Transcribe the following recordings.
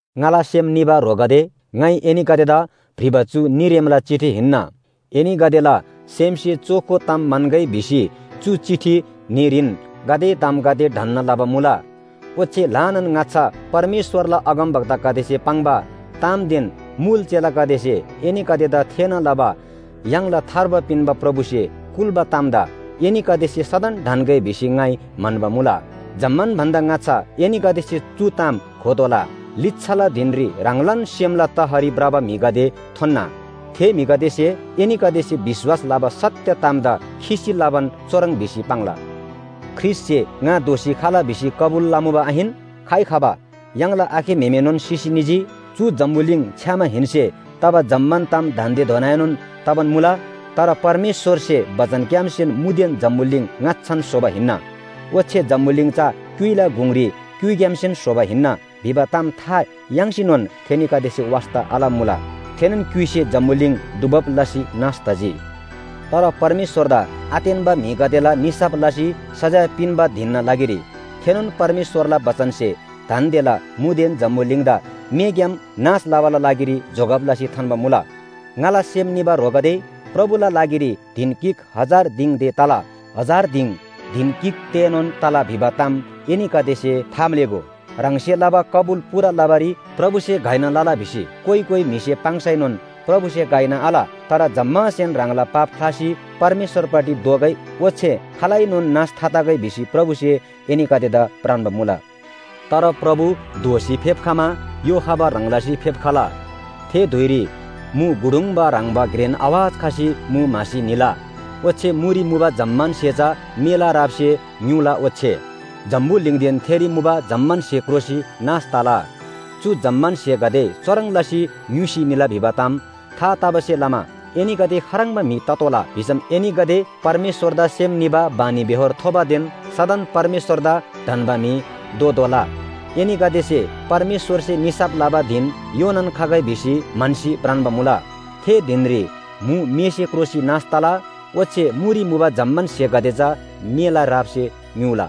ङाला सेम निबा ह्रोगदे, ङाइ एनीगदेदा भ्रिबा चु न्‍हीरेमला चिठी हिन्‍ना, एनीगदेला सेमसे चोखो ताम म्‍हन्‍गै भिसी चु चिठी न्‍हीरीन गाते तामगदे ढन्‍ना लबा मुला। ओच्‍छे ल्‍हानान ङाच्‍छा परमेश्‍वरला अगमवक्तागदेसे पाङ्बा तामदेन मुल चेलागदेसे एनीगदेदा थेःना लबा य्‍हाङला थार्बा पिन्‍बा प्रभुसे कुल्‍बा तामदा एनीगदेसे सदन ढन्‍गै भिसी ङाइ म्‍हन्‍बा मुला। जम्‍मान भन्‍दा ङाच्‍छा एनीगदेसे चु ताम घोतोःला, लिच्‍छाला धिनरी ह्राङलान सेमला तहरी भ्रबा म्‍हिगदे थोन्‍ना। थे म्‍हिगदेसे एनीगदेसे विश्‍वास लबा सत्‍य तामदा खिसी लबान चुह्रङ् भिसी पाङ्ला, “ख्रीष्‍टसे ङा दोःसी खला भिसी कबुल लमुबा आहिन? खाइ खबा? य्‍हाङला आखे म्‍हेमेनोन सिसी निजी, चु जम्‍बुलिङ छ्‌यामाहेन्‍से तबा जम्‍मान ताम दान्‍देधोनाएनोन तबान मुला।” तर परमेश्‍वरसे बचनग्‍यामसेन मुदेन जम्‍बुलिङ ङाच्‍छान स्‍होबा हिन्‍ना, ओच्‍छे जम्‍बुलिङ चा क्‍युइला गुङरी क्‍युइग्‍यामसेन स्‍होबा हिन्‍ना भिबा ताम था याङ्सीनोन थेनीगदेसे वास्‍ता आलमुला। थेनोन क्‍युइसे जम्‍बुलिङ डुबब लसी नाश तजी। तर परमेश्‍वरदा आतेन्‍बा म्‍हिगदेला निसाफ लसी सजाय पिन्‍बा धिनना लागिरी थेनोन परमेश्‍वरला बचनसे दान्‍देला मुदेन जम्‍बुलिङदा मेग्‍याम नाश लबाला लागिरी जोगब लसी थान्‍बा मुला। ङाला सेम निबा ह्रोगदे, प्रभुला लागिरी धिन गिक हजार दिङ ते तला, हजार दिङ धिन गिक तेएनोन तला भिबा ताम एनीगदेसे थाम्‍लेःगो। ह्राङसे लबा कबुल पूरा लबारी प्रभुसे घइना लला भिसी कोइ कोइ म्‍हिसे पाङ्सैनोन प्रभुसे घइना आल। तर जम्‍मासेन ह्राङला पाप ख्‍लासी परमेश्‍वरपट्टि दोःगै ओच्‍छे खालैनोन नाश थातगै भिसी प्रभुसे एनीगदेदा भ्रान्‍बा मुला। तर प्रभु दोःसी फेप्‍खमा य्‍हो खबा ह्रङ् लसी फेप्‍खला। थे धुइरी मु गुडुङ्बा ह्रङ्‌बा घ्रेन आवाज खसी मु म्‍हासी निला, ओच्‍छे मुरी मुबा जम्‍मान स्‍हे चा मेला रापसे ङ्‌युला, ओच्‍छे जम्‍बुलिङदेन थेरी मुबा जम्‍मान स्‍हे क्रोसी नाश तला। चु जम्‍मान स्‍हेगदे चुह्रङ् लसी ङ्‌युसी निला भिबा ताम था तबासे लमा एनीगदे खाह्रङ्बा म्‍हि ततोःला भिसम एनीगदे परमेश्‍वरदा सेम निबा बानीबेहोर थोबादेन सदन परमेश्‍वरदा ढन्‍बा म्‍हि दोतोःला। एनीगदेसे परमेश्‍वरसे निसाफ लबा धिन योनान खगै भिसी म्‍हन्‍सी भ्रान्‍बा मुला। थे धिनरी मु मेसे क्रोसी नाश तला। ओच्‍छे मुरी मुबा जम्‍मान स्‍हेगदे चा मेला रापसे ङ्‌युला।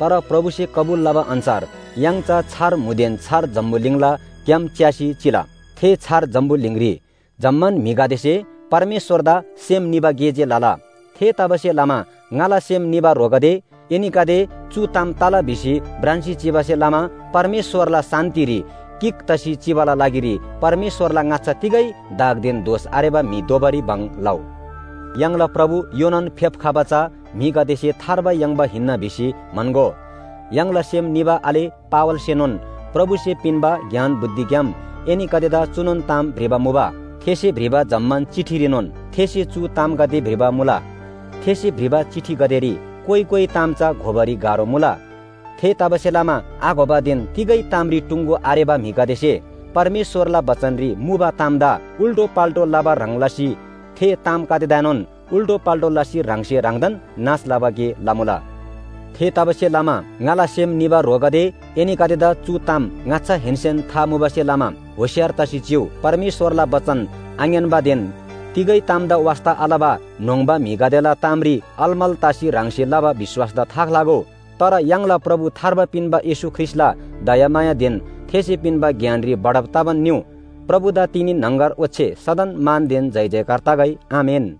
तर प्रभुसे कबुल लबा अन्‍छार य्‍हाङ चा छार मुदेन छार जम्‍बुलिङला ग्‍याम च्‍यासी चिला। थे छार जम्‍बुलिङरी जम्‍मान म्‍हिगदेसे परमेश्‍वरदा सेम निबा गे जे लला। थेतबासेलमा ङाला सेम निबा ह्रोगदे, एनीगदे चु ताम तला भिसी भ्रान्‍सी चिबासे लमा परमेश्‍वरला शान्‍तिरी गिक तसी चिबाला लागिरी परमेश्‍वरला ङाच्‍छा तिगै दागदेन दोष आरेबा म्‍हि दोबारी भङ लउ। य्‍हाङला प्रभु योनान आफेप्‍खबा चा म्‍हिगदेसे थार्बा याङ्बा हिन्‍ना भिसी म्‍हन्‍गो। य्‍हाङला सेम निबा आले पावलसेनोन प्रभुसे पिन्‍बा ज्ञान बुद्धिग्‍याम एनीगदेदा चुनोन ताम भ्रिबा मुबा। थेसे भ्रिबा जम्‍मान चिठीरीनोन थेसे चु तामगदे भ्रिबा मुला। थेसे भ्रिबा चिठीगदेरी कोइ कोइ ताम चा घोबारी गाह्रो मुला। थेतबासेलमा आघोबादेन तिगै तामरी टुङ्‍गो आरेबा म्‍हिगदेसे परमेश्‍वरला बचनरी मुबा तामदा उल्‍टोपाल्‍टो लबा ह्रङ् लसी थे तामगदेदाएनोन उल्‍टोपाल्‍टो लसी ह्राङसे ह्राङदान नाश लबा गे लमुला। थेतबासेलमा ङाला सेम निबा ह्रोगदे, एनीगदेदा चु ताम ङाच्‍छाहेन्‍सेन था मुबासे लमा होशियार तसी चिउ। परमेश्‍वरला बचन आङ्‌यान्‍बादेन तिगै तामदा वास्‍ता आलबा न्‍होङ्बा म्‍हिगदेला तामरी अलमल तसी ह्राङसे लबा विश्‍वासदा थाख्‍लागो। तर य्‍हाङला प्रभु थार्बा पिन्‍बा येशू ख्रीष्‍टला दयामायादेन थेसे पिन्‍बा ज्ञानरी बढब तबान निउ। प्रभुदा तिनी, न्‍हङगर ओच्‍छे सदन मानदेन जयजयकार तगै। आमेन।